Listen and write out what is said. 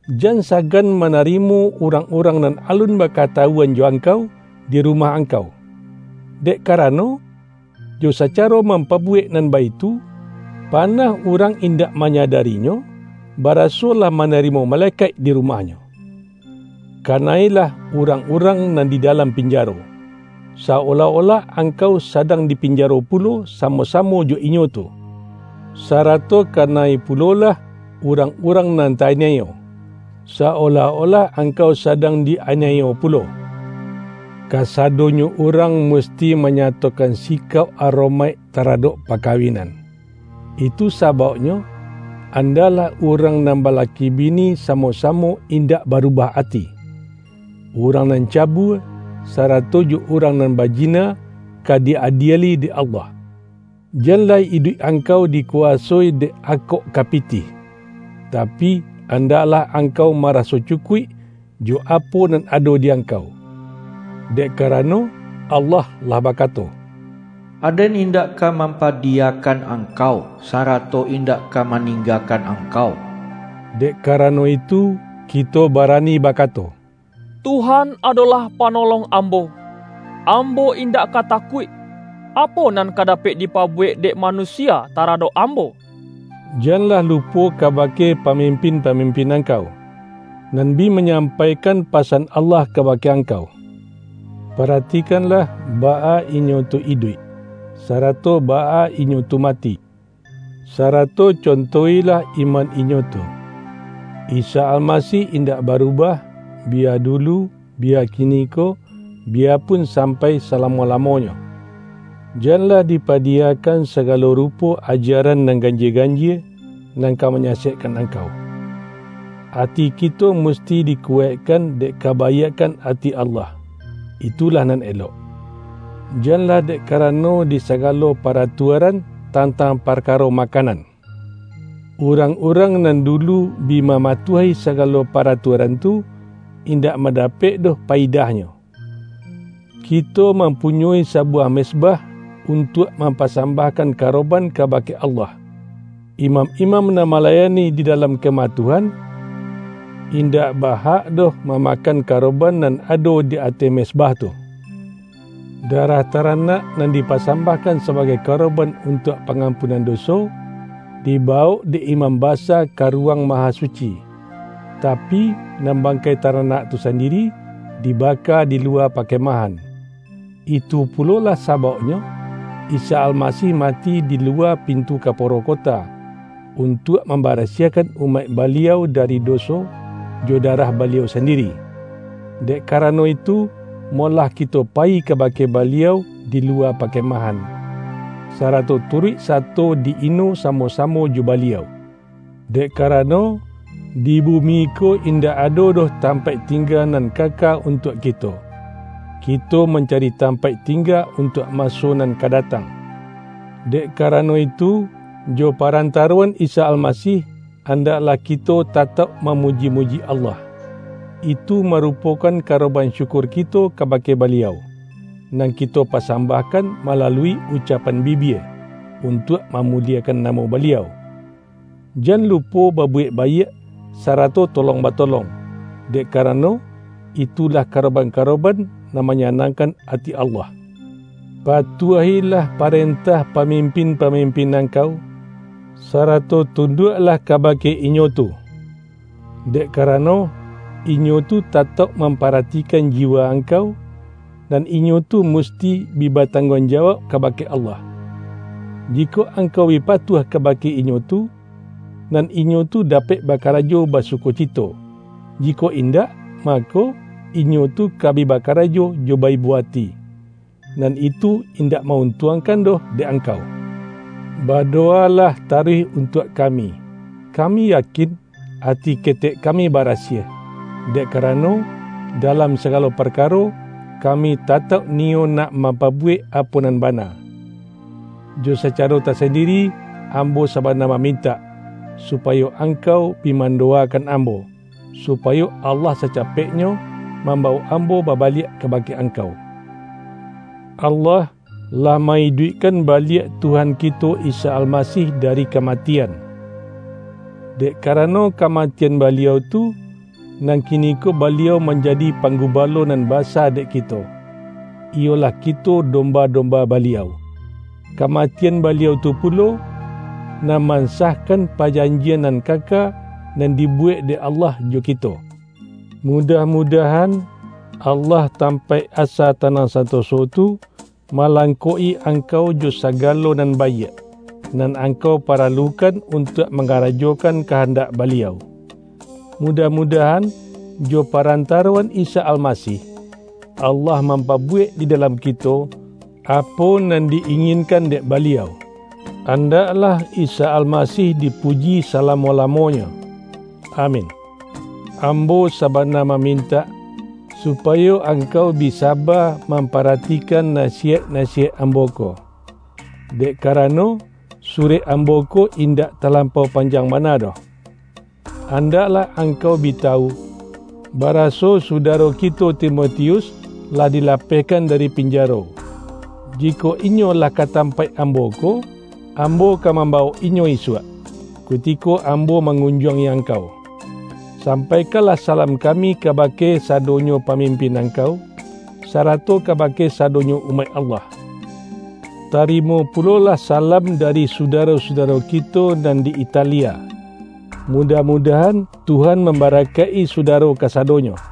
Jan sagan manarimo urang-urang nan alun bakatawuan jo angkau, di rumah angkau. Dek karano, jo sacaro mampabuwek nan baitu, panah urang indak manyadarinyo, baraso lah ma-narimo malekaik di rumahnyo. Ka-na-ilah urang-urang nan di dalam pin-jaro, sa-olah-olah angkau sadang di pinjaro pulo samo-samo jo inyo tu. Sarato kana-i pulolah, urang-urang nan ta-aniayo, sa-olah-olah angkau sadang di-aniayo pulo. Kasadonyo urang musti manya-tokan sikauk aromaik taradok pa-kawinan, itu sabauknyo, andaklah urang nan balaki bini samo-samo in-dak barubah ati. Urang nan cabua, sa-rato jo urang nan bajina, ka di-adieli dek Allah. Janlah iduik angkau dikuwasoi dek akok ka pitih, tapi, andaklah ang-kau maraso cukuik, jo apo nan ado di angkau. Dek karano, Allah lah ba-kato,”Aden indak ka mampadiyakan angkau, sarato indak ka maninggakan angkau.” Dek karano itu, kito bara-ni bakato,”Tuhan adolah Panolong ambo, ambo indak ka takuik. Apo nan ka dapek dipabuwek dek manusia taradok ambo?” Janlah lupo kabake pamimpin-pa-mimpin angkau, nan bi manyampai-kan pasan Allah kabake angkau. Para-tikanlah, baa inyo tu iduik, sarato baa inyo tu mati, sarato conto-ilah iman inyo tu. Isa Almasih indak barubah, biya dulu, biya kiniko, biyapun sampai salamo-lamonyo. Janlah dipadiyakan sagalo rupo ajaran nan ganjie-ganjie, nan ka manyasekkan angkau. Ati kito musti dikuwaikkan dek kabaiakkan ati Allah, itulah nan elok; janlah dek ka-rano di sagalo paratuaran tantang par-karo makanan. Urang-urang nan dulu bi mamatuahi sagalo paratuaran tu, in-dak mandapek doh payidahnyo. Kito mampunyoi sabuwah mez-bah untuak mampasambahkan karo-ban kabake Allah. Imam-imam nan malayani di dalam Kemah Tuhan, in-dak ba-hak doh mamakan karoban nan ado di ateh mezbah tu. Darah taranak nan dipasambahkan sabagai karoban untuak pangampunan doso, dibawok dek imam basa ka Ruwang Mahasuci, tapi, nan bangkai taranak tu sandiri, dibaka di luwa pakemahan. Itu pulolah sabauknyo, Isa Almasih mati di luwa pintu kaporo kota, un-tuak mambarasiahkan umaik Baliau dari doso, jo darah Baliau sandiri. Dek karano itu, molah kito payi kabake Baliau di luwa pakemahan, sarato turuik sato di-ino samo-samo jo Baliau. Dek karano, di bumi ko indak ado doh tampaik tingga nan kaka untuak kito; kito mancari tam-paik tingga untuak maso nan ka da-tang. Dek karano itu, jo parantaro-an Isa Almasih, andaklah kito tatauk mamuji-muji Allah; itu marupokan karoban syukur kito kabake Baliau, nan kito pasambahkan malalui ucap-an bibia, untuak mamuliekan namo Baliau. Jan lupo babuwek baiak, sarato tolong batolong, dek karano, itulah karoban-karoban nan manya-nangkan ati Allah. Patuah-ilah parentah pamimpin-pamimpin angkau, sarato tunduaklah kabake inyo tu. Dek karano, inyo tu tatauk mamparatikan jiwa angkau, nan inyo tu musti bi batangguang ja-wauk kabake Allah. Jikok angkau bi patuah kabake inyo tu, nan inyo tu dapek bakarajo basukocito; jikok in-dak, mako, inyo tu ka bi bakarajo jo ba-ibo ati, nan itu indak ma-untuang-kan doh dek angkau. Badowalah taruih untuak kami. Kami yakin, ati ketek kami barasiah, dek karano, dalam sagalo parkaro, ka-mi tatauk niyo nak mampabuwek apo nan bana. Jo sacaro tasandiri, am-bo sabana mamintak, supayo angkau bi mandowakan ambo, supayo Allah sacapeknyo mambawok ambo baba-liak kabake angkau. Allah, lah ma-iduikkan baliak Tuhan kito Isa Almasih dari kamatian. Dek karano kamatian Baliau tu, nan kiniko Baliau manjadi Panggubalo Nan Basa dek kito, iyolah kito dom-ba-domba Baliau. Kamatian Baliau tu pulo, nan mansahkan pajanjian nan kaka, nan dibuwek dek Allah jo ki-to. Mudah-mudahan, Allah tam-paik asa tanang santoso tu, malang-kok-i angkau jo sagalo nan baiak, nan angkau paralukan untuak mangara-jokan kahandak Baliau. Mudah-mu-dahan, jo parantaroan Isa Almasih, Allah mampabuwek di dalam kito, apo nan di-inginkan dek Baliau. An-daklah Isa Almasih dipuji salamo-la-monyo! Amin. Ambo sabana mamintak, supayo angkau bi saba mamparatikan nasi-yaik-nasiyaik ambo ko, dek karano, surek ambo ko indak talampau pan-jang bana doh. Andaklah angkau bi tawu, baraso sudaro kito Timoti-us, lah dilapehkan dari pinjaro. Jikok inyo lah ka tampaik ambo ko, ambo ka mambawok inyo isuak, kutiko am-bo mangunjuangi angkau. Sampaikanlah salam kami kaba-ke sadonyo pamimpin angkau, sarato kabake sadonyo umaik Allah. Tarimo pulolah salam dari sudaro-sudaro ki-to nan di Italia. Mudah-mudahan, Tuhan mamba-rakaik-i sudaro kasadonyo.